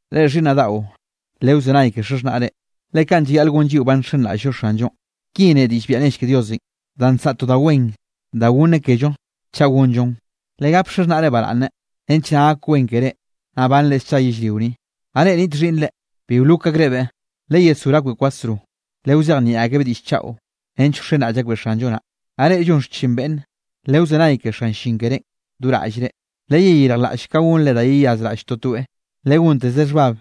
Reꞌ xhiꞌnnaꞌ daꞌo, lewzenay ke xaxhnaꞌre, le kaꞌn llayaꞌl gon lliꞌo ba nxenraꞌll-llo Xanllonꞌ. Ki ne diꞌll biaꞌa nell ke Diosenꞌ, danꞌ nsaꞌa to da wen danꞌ goneꞌ kello chaꞌ gonllon: “Legap xaxhnaꞌre baraꞌnne, nench naꞌ gak wen keré naꞌ banre scha yellrio ni.” Naꞌ reꞌ niꞌt xhiꞌnnre, bi wlok akrebeꞌ, leyesgor akbeꞌ kwasro, lewzejnieꞌ akebeꞌ diꞌll chaꞌo, nench wxenraꞌll akbeꞌ Xanllo naꞌ. Naꞌ reꞌ llon xchin beꞌnne, lewzenay ke xan llin kerénꞌ do raꞌllre, leyeyirjlaꞌll ka gonre da yeyazraꞌll totoeꞌ, legonteze xhbab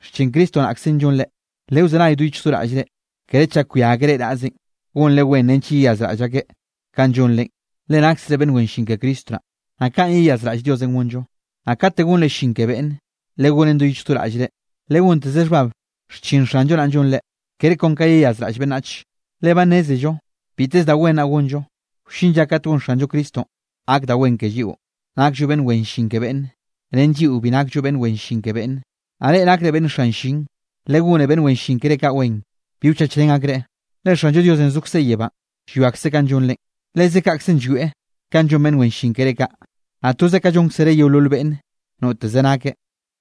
xchin Cristo naꞌkzenꞌ llonre. Lewzenay do yichj do raꞌllre, kere chak llwia akeꞌ reꞌ naꞌzenꞌ, gonre wen nench yeyazraꞌll akeꞌ kanꞌ llonrenꞌ, le naksre beꞌnn wen llin ke Cristo naꞌ, naꞌ kaꞌn yeyazraꞌll Diosenꞌ gonllo. Naꞌ kate gonre llin ke beꞌnnenꞌ, legonen do yichj do raꞌllre, legonteze xhbab xchin Xanllo naꞌn llonre, kere kon ka yeyazraꞌll beꞌnnach. Le ba nnézello biteze da wen naꞌ gonllo, wllin lla kat gon Xanllo Cristonꞌ gak da wen ke lliꞌo, nakllo beꞌnn wen llin ke beꞌnne, ren lliꞌo bi nakllo beꞌnn wen llin ke beꞌnne. Naꞌ reꞌ nakre beꞌnn xan llin, legone beꞌnn wen llin keré kaꞌ wen. Bi wchachrén akreꞌ, le Xanllo Diosenꞌ zokzeꞌ yebánꞌ llwiakzeꞌ kanꞌ llonrenꞌ. Leze kaꞌkzenꞌ llwieꞌ kanꞌ llon beꞌnn wen llin keré kaꞌ, naꞌ toze kaꞌn llónkzereꞌ yeolol beꞌnne noteze nakeꞌ.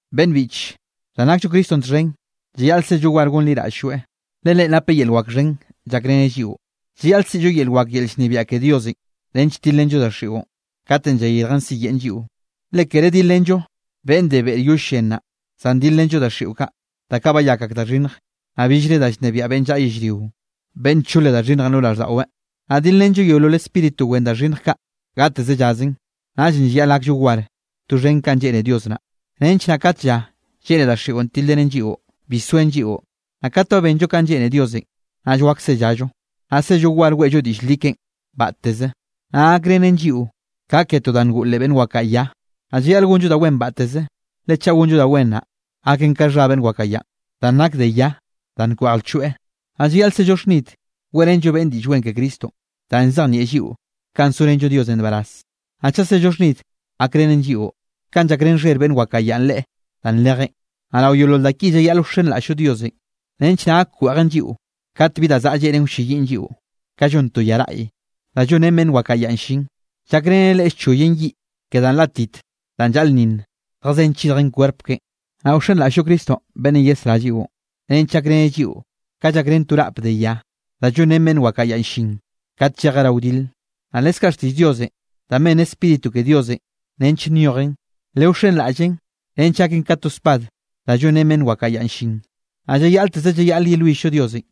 Beꞌnn biꞌche, danꞌ nakllo Cristonꞌ txhen, llayaꞌl sello war gonliraꞌll-lloeꞌ, Le Leꞌen napeꞌ yel wak xhen llakreneꞌ lliꞌo. Llayaꞌl siꞌllo yel wak yel llnebiaꞌ ke Diosenꞌ nench tilrenllo daxiꞌon, kate llayirjen siyeꞌn lliꞌo. Le kere dilrenllo beꞌnn de beꞌrenꞌ yoll llen naꞌ, zan dilrenllo daxiꞌo kaꞌ, da kaꞌ bayak ak da xhinnj, naꞌ billre da llnebiaꞌ beꞌnn llaꞌa yellrio, beꞌnn nchole da xhinnjenꞌ lo raꞌlldaꞌweꞌ. Naꞌ dilrenllo yeolol spíritu wen da xhinnj kaꞌ gateze llazen. Naꞌllenꞌ llayaꞌl gakllo war doxhen kanꞌ lleꞌne Dios naꞌ, nench naꞌ kate lla lleꞌne daxiꞌon tilrenen lliꞌo, bi soen lliꞌo. Naꞌ kat ba benllo kanꞌ lleꞌne Diosenꞌ, naꞌll wak sellallo. Naꞌ sello war weꞌllo diꞌll li keꞌen batteze. Naꞌ gakrenen lliꞌo ka ke to da ngoꞌ leꞌ beꞌnn wakaꞌa ya. Naꞌ llayaꞌl gonllo da wen batteze, le chaꞌ gonllo da wen naꞌ, gaken ka xha beꞌnn wakaꞌa yanꞌ, danꞌ nak de ya danꞌ nkweꞌj lchoeꞌ. Naꞌ llayaꞌl sello xhnid weꞌrenllo beꞌnne Diꞌll Wen ke Cristonꞌ, danꞌ llzejnieꞌ lliꞌo ka sorenllo Diosenꞌ nbaraz. Naꞌ chaꞌ sello xhnid, gakrenen lliꞌo, kanꞌ llakrén xher beꞌnn wakaꞌa ya leꞌe danꞌ nrejeꞌn. Naꞌ rao yeolol da ki llayaꞌl wxenraꞌll-llo Diosenꞌ, nench naꞌ gak wkweꞌjen lliꞌo kat bi da zaꞌa lleꞌnen wlleyiꞌn lliꞌo, ka llon to ya raꞌy, da llonrén beꞌnn wakaꞌa ya llin, llakrenen leꞌe llchoyen yiꞌ ke danꞌ látit danꞌ llaꞌlnninn zjazén chidjen kwerp keꞌen. Naꞌ wxenraꞌll-llo Cristonꞌ beꞌnnenꞌ yesrá lliꞌo, nench gakrenen lliꞌo ka llakrén to raꞌp de ya, da llonrén beꞌnn wakaꞌa ya llin kat llejeꞌ rao wdil. Naꞌ leskaꞌ xtiꞌll Diosenꞌ danꞌ ben Spíritu ke Diosenꞌ nench nyojen, lewxenraꞌllen nench gaken ka to spad da llonrén beꞌnn wakaꞌa yanꞌ llin. Naꞌ llayaꞌlteze llayaꞌl yelwill-llo Diosenꞌ,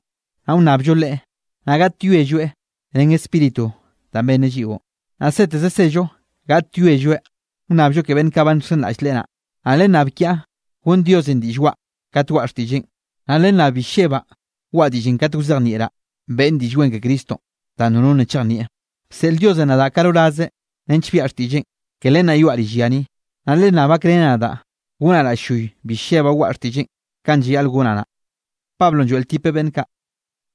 naꞌ wnnabllo Leꞌe, naꞌ gaꞌtyoelloeꞌ ren Spíritu danꞌ benneꞌ lliꞌo, naꞌ seteze sello gaꞌtyoelloeꞌ wnnabllo ke beꞌnn kaꞌ ba nxenraꞌll Leꞌe naꞌ. Naꞌ lennab kiaꞌ gonn Diosenꞌ diꞌll waꞌa kat waꞌa xtiꞌlleꞌn, naꞌ lennab bi llebaꞌ waꞌa diꞌllenꞌ katenꞌ wzejnieꞌraꞌ beꞌnne Diꞌll Wen ke Cristonꞌ danꞌ nono nna chejnieꞌ. Bseꞌl Diosenꞌ nadaꞌ ka rorazeꞌ nench biaꞌa xtiꞌlleꞌn, ke len naꞌ yoaꞌ rill ya ni. Naꞌ lennab gakreneꞌ nadaꞌ gonaꞌ raꞌll-lloy, bi llebaꞌ waꞌa xtiꞌlleꞌn kanꞌ llayaꞌl gonaꞌ naꞌ.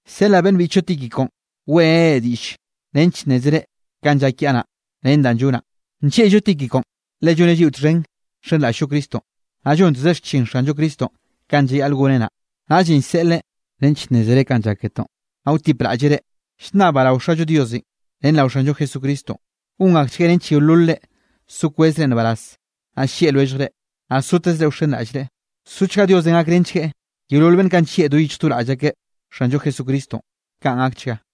Llseꞌlaꞌ beꞌnn biꞌchllo Tíquiconꞌ weꞌreneꞌ reꞌ diꞌll nench nnézere kanꞌ llak kiaꞌ naꞌ, ren da llonaꞌ. Nllieꞌllo Tíquiconꞌ, le lloneꞌ lliꞌo txhen nxenraꞌll-llo Cristonꞌ, naꞌ llonteze xchin Xanllo Cristonꞌ kanꞌ llayaꞌl goneꞌ naꞌ. Naꞌllenꞌ llseꞌleꞌ nench nnézere kanꞌ llak ketoꞌn, naꞌ wtipraꞌlleꞌ reꞌ. Llnnabaꞌ rao Xallo Diosenꞌ ren rao Xanllo Jesucristonꞌ, gon akchgueꞌ nench yeololre so kwezre nbaraz, naꞌ llieꞌ lwelljre, naꞌ sotezre wxenraꞌllreꞌ. Sochga Diosenꞌ gakrenchgueꞌ yeolol beꞌnn kaꞌ nllieꞌ do yichj do raꞌll akeꞌ Xanllo Jesucristonꞌ. Kaꞌn gakchga.